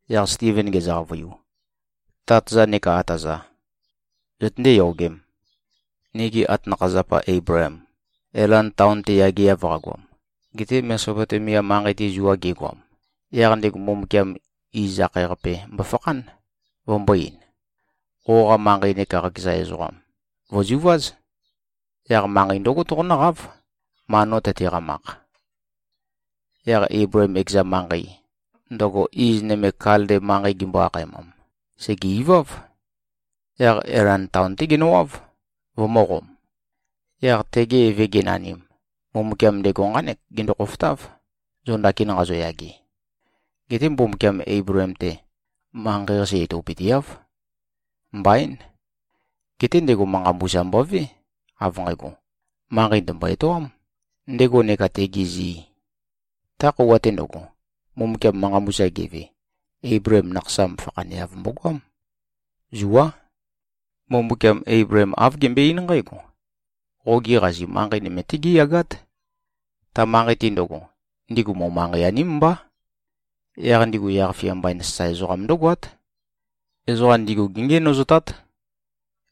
Yaq Stiven gezø-qavøiu, “Tát-za neka ata-za! Zøtøndé-yogēm. Nigi atanakha-zapa Eibleem, Elan taon-te yageav qagoam, gete Mesopotemia manqei-te zua gegoam, yaq ndego Mbumbukiam Iz-akhae-qape mbofakhán, vømbō-ein, ‘Qoqa manqei neka qakeza ezoqa vø̀zuváz. Yaq manqei ndǿgo toqonǿqáv, ma no tøteqamakh.’ Yaq Eibleem ekeza manqei, ndøgo iz nøme Kalde manqei gimbo-akhaemam, sège-iváv. Yaq Elan taon-té genøwáv, vømø̄qom. Yaq tege eve genanim, Mbumbukiam ndego nqánek gendo-khofotáv, zo ndakin nqazoyage. Geté Mbumbukiam Eibleem-te, manqei-qase etopøteáv. Mbaín! Geté ndego manqa mbusa mbové, av nqægo, manqei ndø̀mbo-etoām, ndego neka tegi zi. Ta khøuwa-te ndøgo, Mbumbukiam manqa mbusa geve, Eibleem nakhasam fakhaneav mbogoám. Zuá. Mbumbukiam Eibleem āv gembøe-eín nqǽgo, ‘Qogi qazi manqei nøme-té géyagát. Ta manqei-te ndøgo, ndigu mo-manqei-aním mbá. Yaq ndigu yaq-fia mbain sasae ezoqam ndǿgoát. Ezoqa ndigu géngenøzotát.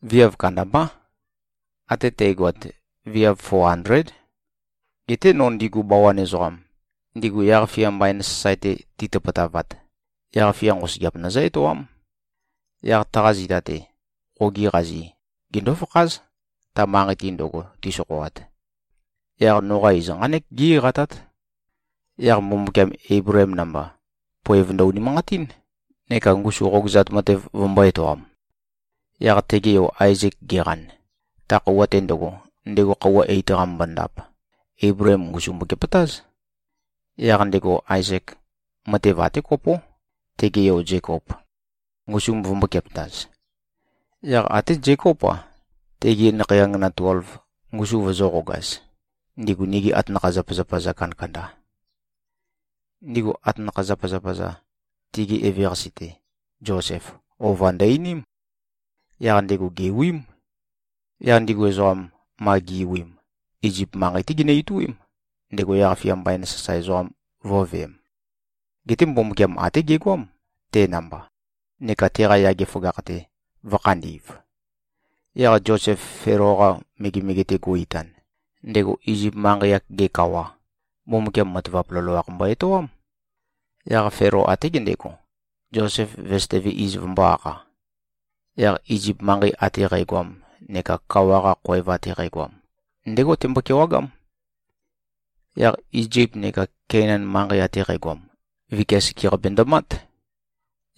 Viav kandambá. Até tægoat, viav fo andléd. Geté no ndigu bawan ezoqam, ndigu yaq-fia mbain sasae-te titøpøtavat, yaq-fia nqosøgeap nøzǿ-etoám. Yaq taqa zita-te, qogi qazi gendó-fakház, ta manqei-te ndøgo ti꞉sokhoat. Yaq noqa iz nqánek gí-eqatát.’ Yaq Mbumbukiam, Eibleem namba, poev ndø-unimanqatín, neka ngusu qogøzat matev vømbō-etoam. Yaq tege yo Aezek geqan, ta khøuwa-te ndøgo, ndego khøuwa eit qamømbo-ndap, Eibleem ngusum mbokepøtáz. Yaq ndego Aezek, matev até kopó, tege yo Zekop, ngusum vømbōkepøtaz. Yaq até Zekóp-a, tegi nakhei angana tuelv, ngusu vøzø̄qogaz, ndigu nigi atanakha-zapazapa-za kandakanda. Ndigu atanakha-zapazapa-za, tigi eveqase-te Zosef, ova ndø-einím. Yaq ndego gèwiím. Yaq ndigu ezoqam, ma gi꞉wiim, Izip manqei-té ginø-ituím, ndego yaq-fia mbain sasae ezoqam vø̄veem. Geté Mbumbukiam até gegoám, te namba, neka teqa yage føgakh-te vø̄khandi꞉v. Yaq Zosef Felo-qa megemege-te go꞉-itan, ndego Izip manqei-ak-ge kawa, Mbumbukiam matavap loloakh mbo-etoám. Yaq Felo, até gendego, Zosef vesøteve iz vømbō-akha. Yaq Izip manqei ate qægoam neka kawa-qa khoev ate qægoam, ndégo tembo-kewagám. Yaq Izip neka Keinan manqei ate qægoam, vikia sekeqape ndømát.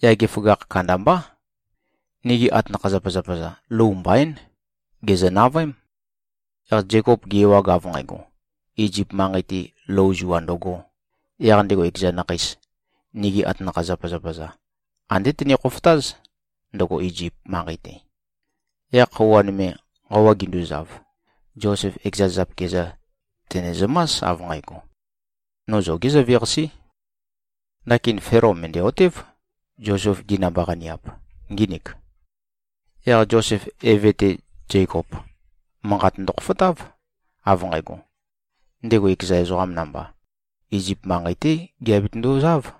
Yage føgakh kandambá. Nigi atanakha-zapazapa-za, lou mbaín. Gèzø-navøém. Yaq Zekop ge-ewag, av nqægo, Izip manqei-te, lou zua ndøgō, yaq ndego ekeza nakheis, nigi atanakha-zapazapa-za, andé tene-khofotáz, ndøgo Izip manqei-te. Yaq khøuwa nøme nqawa ginduzav, Zosef ekeza zapikia-za tènezømás, av nqægo, ‘No zogé zøveqasé.’ Ndakin Felo mø̀ndæ-otév, Zosef-gi namba-qaniap ngínik. Yaq Zosef eve-te Zekop, manqat ndøkhofotáv, av nqægo: Ndego ekeza ezoqam namba, Izip manqei-té giabetøndozáv.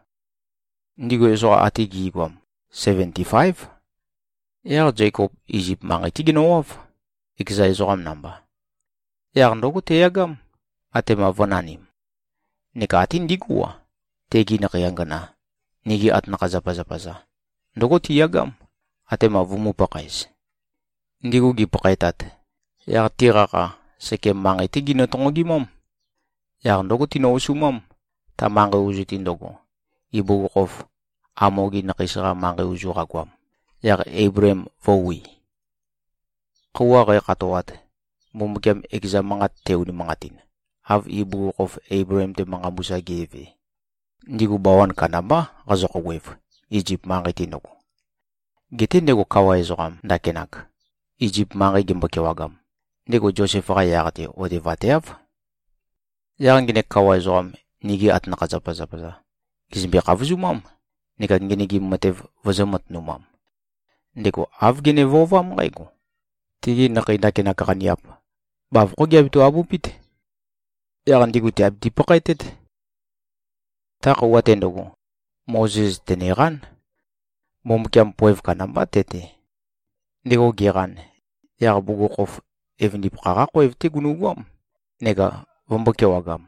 Ndigu ezoqa ate gi꞉goam seventi-fáev. Yaq Zekop Izip manqei-té genøwáv, ekeza ezoqa namba. Yaq ndǿgo teyagám, atema vø̄nanim. Neka até ndigú-a, tegi nakhei angana, nigi atanakha-zapazapa-za, ndǿgo tiyagám, atema vumū-pakhaez. Ndigu gipakhaetat, yaq tiqa kha Sekem manqei-té ginø-tonqogimám. Yaq ndǿgo, tinø-osumám, ta manqei ozu-te ndøgo, ibugukhokhof Hamo-gi nakheis-qa manqei ozu qagoam, yaq Eibleem vø̄wi. Khøuwa qækhatoat, Mbumbukiam ekeza manqat te-unimanqatin, av ibugukhokhof Eibleem-te manqa mbusa ge꞉ve, ndigu bawan kandambá qazø-khouwev, Izip manqei-te ndøgo. Geté ndego kawa ezoqam ndakinak, Izip manqei gembo-kewagam, ndego Zosef-qa yaq-te otevateáv. Yaq ngenek kawa ezoqam, nigi atanakha-zapazapa-za gèzømbe-khavozumám neka ngenøgim matev vøzø̄-matønumam. Ndego āv gene-vøovám nqǽgo: Tigi nakhei ndakinak qaniap, bavokhó giabeto-abupít. Yaq ndigu tìabiti-pakhaetét. Ta khøuwa-te ndøgo, Mozes tèneqán. Mbumbukiam poev kandambá te-te. Ndego geqan, yaq bugukhokhof evøndipakha-qá khoev-té gunugoám, neka vømbō-kewagam.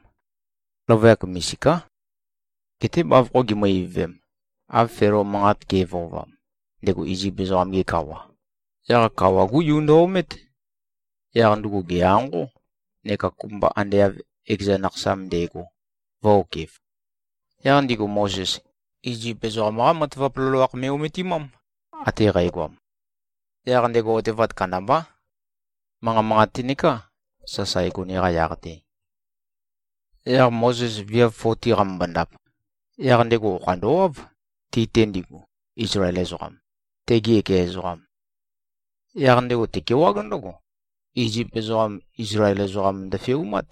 Løvøyak misiká. Geté bavokho gimø-ivøvem, av Felo manqa ge꞉vøovam, ndego Izip ezoqam-ge kawa, yaq kawa-gú yu ndø-omét. Yaq ndugu gè-anqó, neka kopømba ande av ekeza nakhasam nde꞉go vø̄-okef. Yaq ndigu Mozes, Izip ezoqam-qá matavap loloakh me꞉-ometimám, ate qægoam. Yaq ndego otevat kandambá. Manqa manqate nekā sasae gone-qa yaq-te. Yaq Mozes viav foti qamømbo-ndap, yaq ndego okha ndøwáv, ti-te ndigu, Izlael ezoqam, tegi ekeza ezoqam. Yaq ndego tekewág ndǿgo, Izip ezoqam, Izlael ezoqam ndøfeumát.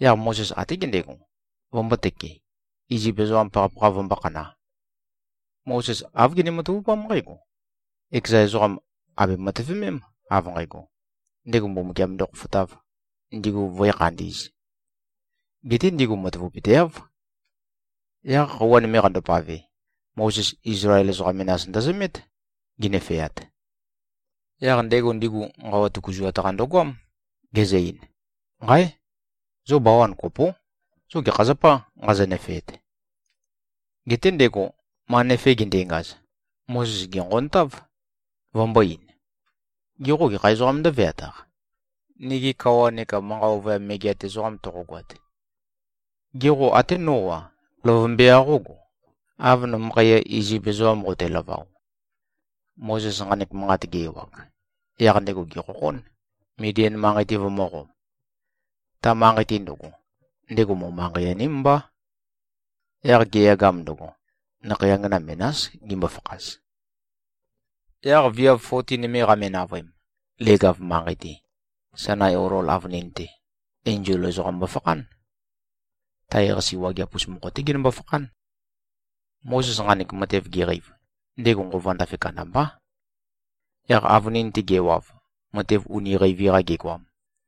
Yaq Mozes até gendego, vømbōtøke, Izip ezoqam pakhapakha vømbō-khana. Mozes āv gene-matavupám nqǽgo: Ekeza ezoqam àbe-matøvemém, av nqægo, ndego Mbumbukiam ndokhofotāv, ndigu vǿe-khandī꞉z. Geté ndigu matavapøteáv. Yaq khøuwa nøme qandopave, Mozes Izlael ezoqa menas ndøzømét, ginøfeat. Yaq ndego ndigu nqawa tøkuzuat-qa ndøgoám, gezø-ein, ‘Nqáe! Zo bawan kopó. Zo gekha zapâ, nqazo-nøfeet?’ Geté ndego, ma nøfe gendengaz, Mozes gènqontáv, vømbō-ein, ‘Ge qô, gekha ezoqām ndǿveataq, nigi kawa neka manqa ovøyam megeat ezoqam toqogoat? Gê, qo até nó-a, løvømbe-qa qógo, av nømøkhaiya Izip ezoqam qotelavao?’ Mozes nqanek manqat ge-ewag, yaq ndego gèkhokhón, Midian manqei-te vømø̄qom. Ta manqei-te ndøgo, ndego mo-manqei-aním mbá. Yaq geyagam ndøgo, nakhei angana menás gimbo-fakhaz. Yaq viav foti nøme qame-navøem, leg-av manqei-te, Sainai olol avønin-te, enzol ezoqam mbofakhán. Tae-qase wageap-us mokho-té genømbo-fakhán. Mozes nqanek matev geqeiv, ndego nqova ndafe kandambá. Yaq avønin-te gewav, matev uni qeivi-qa gegoam,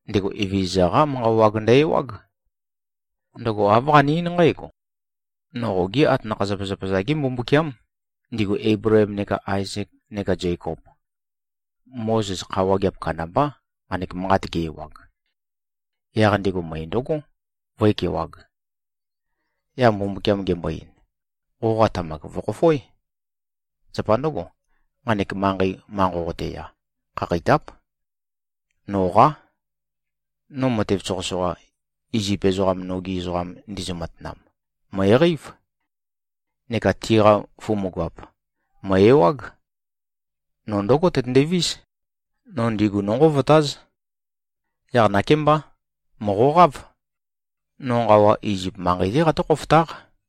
ndego Evezøza-qá manqa wag ndø-ewág. Ndøgo āv qane-eín nqǽgo, ‘No qogi atanakha-zapazapa-za-gé Mbumbukiám, ndigu Eibleem neka Aezek neka Zekop.’ Mozes kha wageap kandambá, nqanek manqat ge-ewag. Yaq ndego møe ndøgó, vǿekewāg. Yaq Mbumbukiam gembo-ein, ‘Qoqa tamak vø̀khofoé. Zapa ndǿgo, nqanek manqei, ma nqoqote-ya, khakheitáp. Noqá. No matev soqøsoqa, Izip ezoqam nogi ezoqam ndizø-matanam, mø̀eqeív. Neka tiqa fumugap, mø̀e-ewág. No ndǿgo tøtøndevís, no ndigu nónqovotáz. Yaq nakémbá, mòqoqáv. No nqawa Izip manqei-té qatǿ-khofotáq.’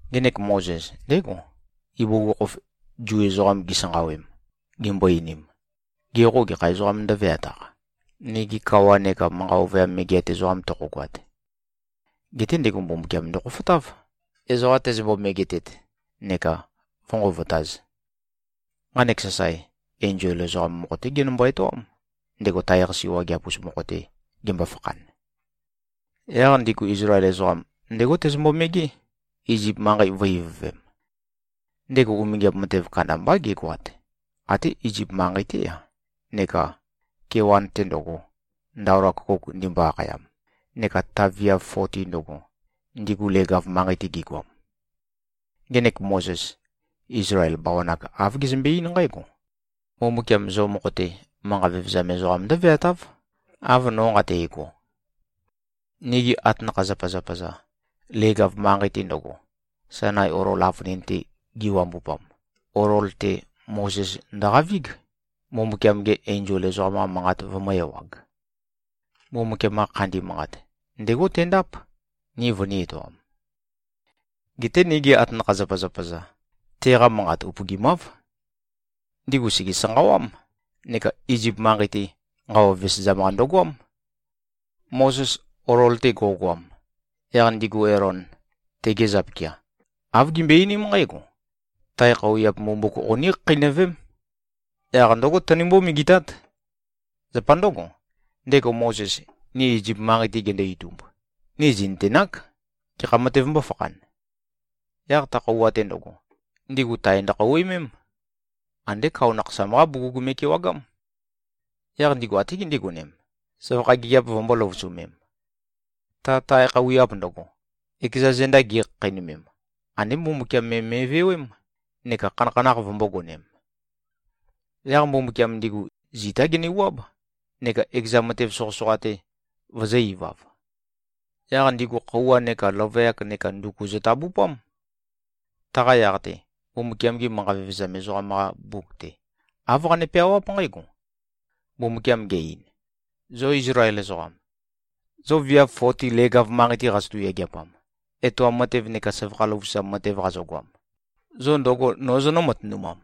Ngenek Mozes, ndégo, ibugukhokhof Zu ezoqam gisanqawem, gimbo-einim, ‘Ge qô, gekha ezoqām ndǿveataq, nigi kawa neka manqa ovøyam megeat ezoqam toqogoat?’ Geté ndego Mbumbukiam ndokhofotáv, ezoqa tezømbo-megetet neka vǿnqovotāz. Nqanek sasae, enzol ezoqam mokho-té genømbo-etoám, ndego tae-qase wageap-us mokho-te gembo-fakhan. Yaq ndigu Izlael ezoqam, ndégo tezømbo-megé, Izip manqei vø̄-ivøvem. Ndego umingiap matev kandambá gegoat, até Izip manqei-té-a neka kewan-te ndøgo, Ndaola Køkouk ndimbo-akhayam, neka ta viav foti ndøgo, ndigu leg-av manqei-te gigoam. Ngenek Mozes, Izlael bawan-ak āv gezømbe-eín nqǽgo, ‘Mbumbukiam zo mokho-te manqa vevezam ezoqam ndǿveatáv, av no nqate꞉go.’ Nigi atanakha-zapazapa-za, leg-av manqei-te ndøgo, Sainai olol avønin-te giwambupam, olol-te Mozes ndøqavíg, Mbumbukiam-ge enzol ezoqam-qa manqat vømø̄-ewag. Mbumbukiam-qa khandi manqat, ndégo tendáp, ni vønī-etoam. Geté nigi atanakha-zapazapa-za, teqa manqat upøgimáv. Ndigu sège-sanqawám, neka Izip manqei-te nqawa vesezam-qa ndøgoám. Mozes olol-te go꞉goam, yaq ndigu Elon, tege zapikia, āv gimbøe-einím nqǽgo, ‘Tae khøuwiap mbumbuk qoní-khakheinøvém. Yaq ndǿgo tønimbó-megetát. Zapa ndǿgo, ndego Mozes, ni Izip manqei-te gendo-itumb, ni zì꞉nøtenák, gekha matev mbōfakhan.’ Yaq ta khøuwa-te ndøgo, ndigu tae ndøkhøuwimém. Andé kao nakhasam-qá bugug me꞉kewagám. Yaq ndigu até gindigonem, søvakha gigiap vømbō-løvusømem. Ta tae khøuwiap ndøgo, ekeza zenda gi꞉khakheinømem, andé Mbumbukiam me me꞉vewém, neka khanakhanakh vømbōgonem. Yaq Mbumbukiam ndigu zitá genewuáb, neka ekeza matev soqøsoqa-te vøzø̄-ivav. Yaq ndigu khøuwa neka løvøyak neka nduku zøtabupám. Taqa yaq-te, Mbumbukiam-gi manqa vevezam ezoqam-qa mbuk-te, āv qane-peawáp nqǽgo, ‘Mbumbukiam ge-ein, “Zo Izlael ezoqam. Zo viav foti leg-av manqei-te qazotu-yageapam, etoam matev neka søvakha løvusam matev qazogoam, zo ndøgo nō zonǿ-matønumam?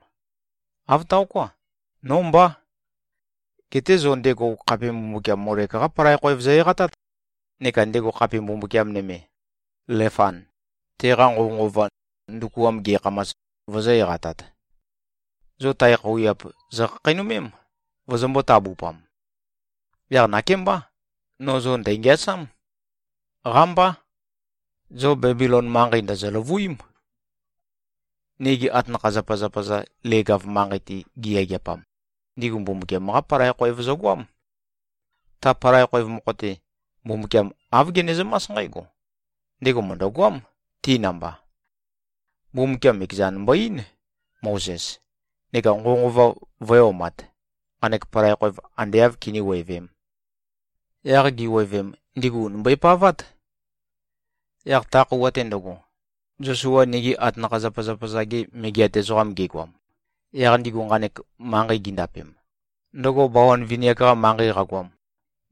Āv taoká. Nó mbá. Geté zo ndego khape mbumbukiam Molek-qá palai khoev zo-eqatát neka ndego khape mbumbukiam nøme, Lefan, teqa nqovønqova, ndukuam ge꞉khamas, vozō-eqatat. Zo tae khøuwiap zokhakheinømém, vozombō-tabupam. Yaq nakémbá, no zo ndæ̀ngeasám. Qámbá. Zo Bebilon manqei ndòzo-løvuím.” ’ Nigi atanakha-zapazapa-za leg-av manqei-te giyageapam, ndigu Mbumbukiam-qá palai khoev zøgoám. Ta palai khoev mokho-te, Mbumbukiam āv genezømás nqǽgo: Ndego mø̀ndøgoám, ti namba. Mbumbukiam ekezan mbo-eín, Mozes, neka nqovønqova vø̄e-omat, nqanek palai khoev ande āv kiníwevēm. Yaq giwevem, ndigu ùni mbøepavát. Yaq ta khøuwa-te ndøgo, Zosua nigi atanakha-zapazapa-za-ge megeat ezoqam gegoam, yaq ndigu nqanek manqei gindapem, ndøgo bawan vini-ak-qa manqei qagoam,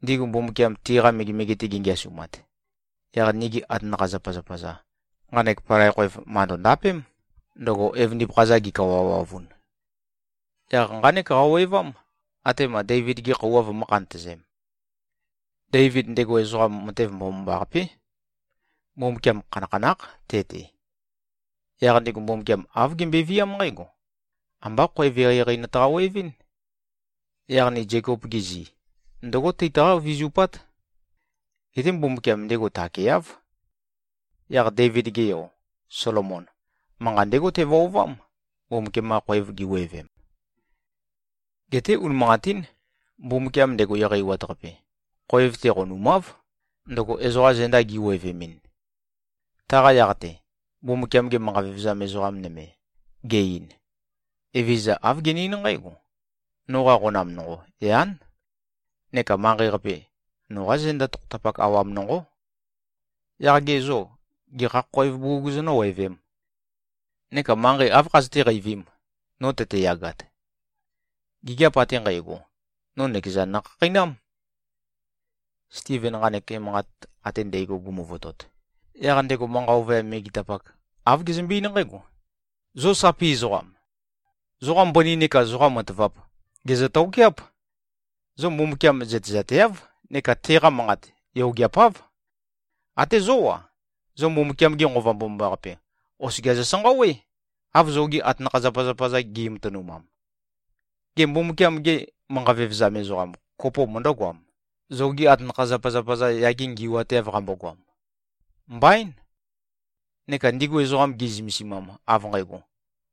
ndigu Mbumbukiam tiqa megemege-te gengeasumat, yaq nigi atanakha-zapazapa-za nqanek palai khoev màndo-ndapém, ndøgo evøndipakha-za gi꞉kawawavun. Yaq nqánek qawevám, atema Deivid-gi khøuwa vømø̄-khantøzem. Deivid, ndego ezoqam matev mbomambaqapé. Mbumbukiam khanakhanákh te-te. Yaq ndego Mbumbukiam āv gembøeviám nqǽgo, ‘Ambá khoev eqeieqei nøtaqa-wevɨ́n. Yaq ni Zekop-gi zi, ndǿgo teitaqá-vizupát?’ Geté Mbumbukiam ndego takeáv. Yaq Deivid-ge yo, Solomon, manqa ndégo tevøovám, Mbumbukiam-qa khoev giwevem. Geté unimanqatín, Mbumbukiam, ndego Eqeiwat-Qape, khoev-te qonumáv, ndøgo ezoqa zenda gi꞉wevemɨn. Taqa yaq-te, Mbumbukiam-ge manqa vevezam ezoqa nøme, ge-ein, ‘Evezøza āv gene-eín nqǽgo, “Noqa qonam nonqo, yán. Neka manqei-qape, noqa zenda tokhotapak awam nonqó. Yaq ge zô, gekha khoev bugug zonǿwevēm? Neka manqei áv khazøté-qeivīm, no tøteyagat? Gigiap ate nqægo, no nøkezan nokhakheinám.”’” Stiven nqanek emanqat ate ndægo gumuvotot, yaq ndego manqa ovøyam megetapak, āv gezømbe-eín nqǽgo, “Zo sapi ezoqám! Zoqa mbøni neka zoqa matavap gèzø-tokeáp. Zo Mbumbukiam zøtezateáv neka teqa manqat yogeapáv. Até zó-a, zo Mbumbukiam-ge Nqova Mbomambaqape oskia zosanqawé, av zogi atanakha-zapazapa-za gi꞉matønumam. Gê, Mbumbukiam-ge manqa vevezam ezoqa kopo møndǿgoam, zogi atanakha-zapazapa-za yage ngi꞉wateav qambogoam? Mbaín. Neka ndigu ezoqam, ge꞉zømesimam, av nqægo,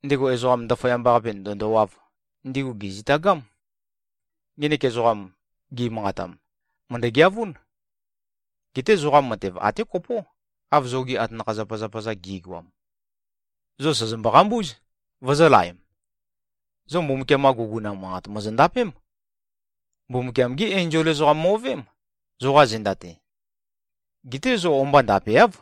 ndego Ezoqam Ndaføyamba-qape ndø̀ndowāv, ndigu gèzitagám. Ngenek ezoqam, gi꞉manqatam, mø̀ndø-geavún. Geté zoqa matev até kopó, av zogi atanakha-zapazapa-za gi꞉goam. Zo sòzombo-qambúz, vozōlaem. Zo Mbumbukiam-qa guguna manqat mòzondapém. Mbumbukiam-gí enzol ezoqam mo꞉veém, zoqa zenda-te. Geté zo o-mba ndapeáv.”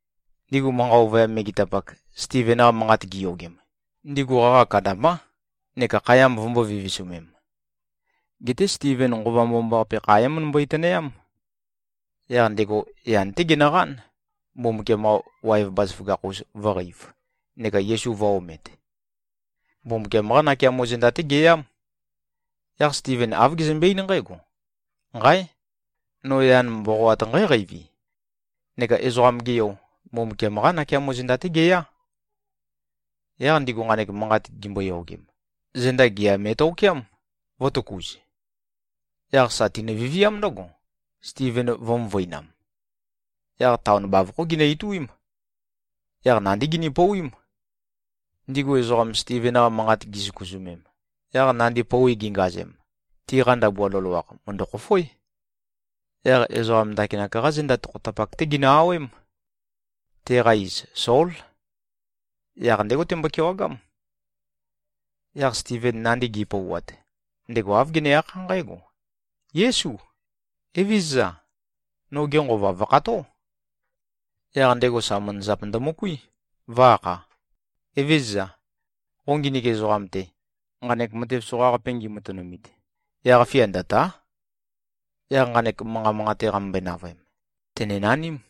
Ndigu manqa ovøyam megetapak, Stiven-qa manqat giyogem, ndigu qaqa kandambá neka khaya vømbō-vivisumem. Geté Stiven, Nqova Mbomambaqape kha é-møndømbøi-tønøyám. Yaq ndego yan-té genøqán, Mbumbukiam-qa waev bazaføgakh-us vø̄qeiv neka Yesu vø̄-omet. Mbumbukiam-qá nakeamo zenda-té geyám. Yaq Stiven āv gezømbe-eín nqǽgo, “Nqáe! No yan mboqoat nqǽqeivi. Neka Ezoqam-ge Yo, Mbumbukiam-qá nakeamo zenda-té geyá.” Yaq ndigu nqanek manqat gimboyogem, zenda gea me꞉tokeám, vø̄tøkuz. Yaq sa tinø-viviám ndǿgo, Stiven vø̄-møvøinam. Yaq taon bavokhó ginø-ituím. Yaq nandí gini-pouwím. Ndigu ezoqam, Stiven-qa manqat gisøkuzømem, yaq nandi pouwi gingazem, tiqa ndabua loloakh mø̀ndøkhofoé. Yaq ezoqam ndakinak-qá zenda tokhotapak-té ginø-awém. Teqa iz, Sól. Yaq ndégo tembo-kewagám. Yaq Stiven nandi gi꞉pouwat, ndego āv gene-akhá nqǽgo, “Yésu. Evézøza! Noge nqova vø̀kható!” Yaq ndego sa manazap ndømøkuí, vø̄-akha, “Evézøza! Qo nginik ezoqam-te, nqanek matev soqaqape ngimatønumit, yaq-fia ndø̀ta᷄.” Yaq nqanek manqa manqate qamømbøe-navøem, tènenaním.